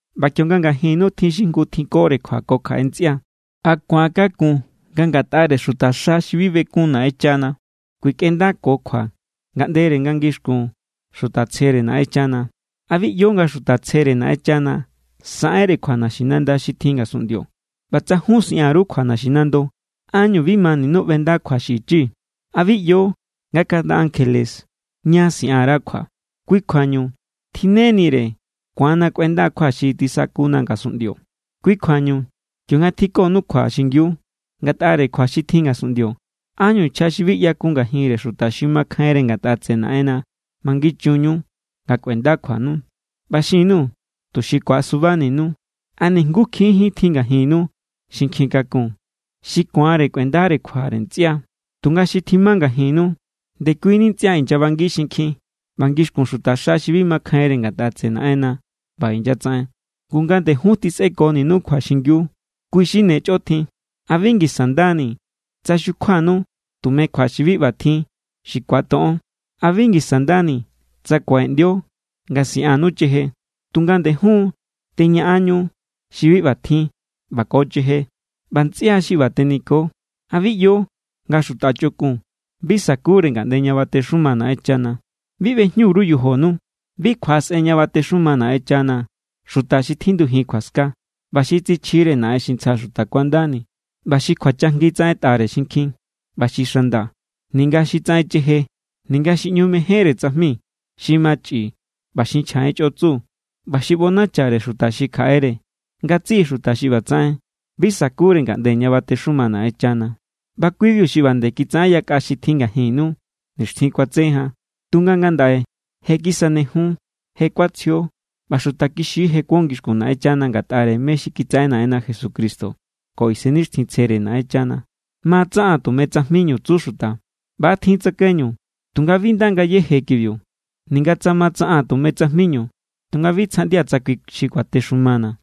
ꞌBa kionga ngajinnu tjin jngu xi tjinkore kjua ko kjaꞌe ntsꞌia, ¿a ku̱an= kakun nga ngatꞌare xutaxa xi bi bekun Naꞌenchana kjuikꞌendako kjua ngaꞌndere nga ngixkun xuta tsjere Naꞌenchana? ¿A bi ꞌyo nga xuta tsjere Naꞌenchana saꞌenre kjua naxinanda xi tjin ngasunꞌndio? ꞌBa tsa jun siꞌan_ru kjua naxinando, ¿ánñu bi maninu ꞌbenda kjua xi ichi? ¿A bi ꞌyo nga kaꞌnda ankjele ña siꞌan_ra kjua? Kui kjuañu tjinnenire ku̱anna kꞌuenda kjua xi tisakuna ngasunꞌndio. Kui kjuañu kionga tjinkonu kjua xingiu ngatꞌare kjua xi tjin ngasunꞌndio, ¿ánñu nchja xi bi ꞌyakun ngajinre xuta xi makjainre ngatꞌa tseꞌe Naꞌenna mangichunñu nga kꞌuenda kjuanu? ꞌBi xin_nuu̱ tuxi ku̱asubaninu. ¿A nijngukjín= tjin ngajinnu xi nkjin kakun, xi ku̱anre kꞌuendare kjua ntsꞌia? Tunga xi tjima ngajinnu, ndekuini ntsꞌia inyabangi xinkjin ꞌba ngixkun xutaxa xi bi makjainre ngatꞌa tseꞌe Naꞌenna ꞌba inyatsaꞌen. Ngu nga nde jun tjisꞌekonu kjua xingiu, kui= xi ne chꞌo tjin. ¿A bi ngisa nda ni tsa xukjuakonu tume kjua xi bi ꞌba tjin xi ku̱atoꞌon? ¿A bi ngisa nda ni tsa kuaꞌeꞌndio nga siꞌannu cheje? Tunga nde jun= teñaꞌanñu xi bi ꞌba tjin ꞌba ko cheje. ꞌBa ntsꞌia xi ꞌba teniko. ¿A bi ꞌyo nga xuta chꞌokun bi sa̱kure ngaꞌnde ña batexuma Naꞌenchana? Bi ꞌbejñu_ru yojonu. Bi kjuaꞌasꞌen ña batexuma Naꞌenchana xuta xi tjindujin kjuaska, ꞌba xi tsichjire naꞌen xi ntsja xuta kuandani, ꞌba xi kjuachajngi tsaꞌentꞌare xinkjin, ꞌba xi xanda, ninga xi tsaꞌen cheje, ninga xi ꞌñu mejénre tsajmi, xi machꞌi, ꞌba xi nchja en chꞌotsu, ꞌba xi ꞌbonachare xuta xi kjaꞌere. Ngatsiꞌi xuta xi ꞌba tsaꞌen, bi sa̱kure ngaꞌnde ña batexuma Naꞌenchana. ꞌBa kui=biu xi ꞌba nde kitsaꞌen yakꞌa xi tjin ngajinnu nixtjin kuatse jan. Tunga ngandaꞌe je= kisanejun, je kuatsjio, ꞌba xuta kixi= je kuon ngixkun Naꞌenchana ngatꞌare mé= xi kitsaꞌen Naꞌenna Jesucristo ko Isennixtjintsjere Naꞌenchana. “Ma= tsaꞌaa̱n tume tsajminu”, tsu xuta. ꞌBa= tjin tsakaiñu, tunga bi nda ngayéje kibiu. Ninga tsa ma tsaꞌaa̱n tume tsajminu, tunga bi sjaꞌndia̱ tsa kui xi kuatexumana̱.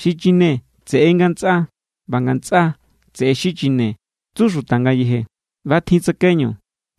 “Xi chine tseꞌe= ngatsꞌa, ꞌba ngatsꞌa tseꞌe= xi chine”, tsu xuta ngayeje. ꞌBa= tjin tsakaiñu,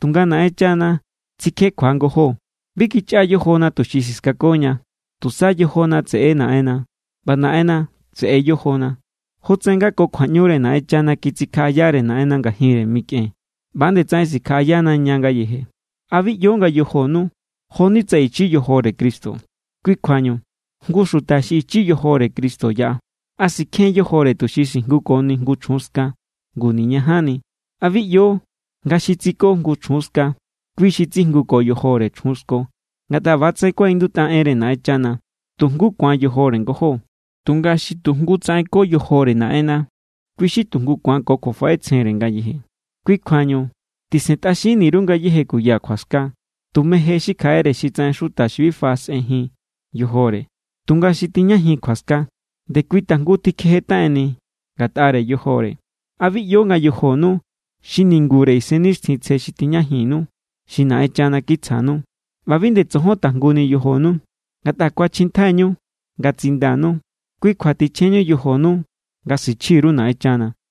tunga Naꞌenchana sikjekjua ngojó. Bi kichꞌa yojona tuxi siskakoña. Tusa yojona tseꞌe= Naꞌenna, ꞌba Naꞌenna tseꞌe yojona. Jotsaꞌen nga ko kjuaꞌñure Naꞌenchana kitsikjaꞌayare Naꞌenna ngajinre mikꞌen, ꞌba=nde tsaꞌen sikjaꞌayana ña ngayeje. ¿A bi ꞌyo nga yojonu, jo=ni tsa ichi yojore Cristo? Kui kjuañu, jngu xuta xi ichi yojore Cristo yaꞌa, ¿a sikjen yojore tuxi sijngukoni jngu chjun ska? ¡Ngu niñajanni! ¿A bi ꞌyo nga xi tsiko jngu chjun ska, kui xi tsijnguko yojore chjun sko? Ngatꞌa ꞌba=tsaꞌen kuaꞌindutꞌa enre Naꞌenchana: “Tu jngu ku̱an yojore ngojó.” Tunga xi tu jngu tsaꞌen ko yojore Naꞌenna, kui= xi tu jngu ku̱an ko kjuafaꞌetsjenre ngayeje. Kui kjuañu tisentꞌaxin_ru ngayéje kuya kjuaska. Tume je xi kjaꞌere xi tsaꞌen xuta bi faꞌasꞌenjin yojore. Tunga xi tijñajin kjuaska, nde kui tajngu tikjejetaꞌenni ngatꞌare yojore. ¿A bi ꞌyo nga yojonu xi ningure Isennixtjintsje xi tijñajinnu, xi Naꞌenchana kitsjanu? ꞌBa bi nde tsojon tajnguni yojonu. Ngatꞌa kuachjintjaiñu nga tsindanu. Kui kjua tichjenñu yojonu nga sichji_ru Naꞌenchana.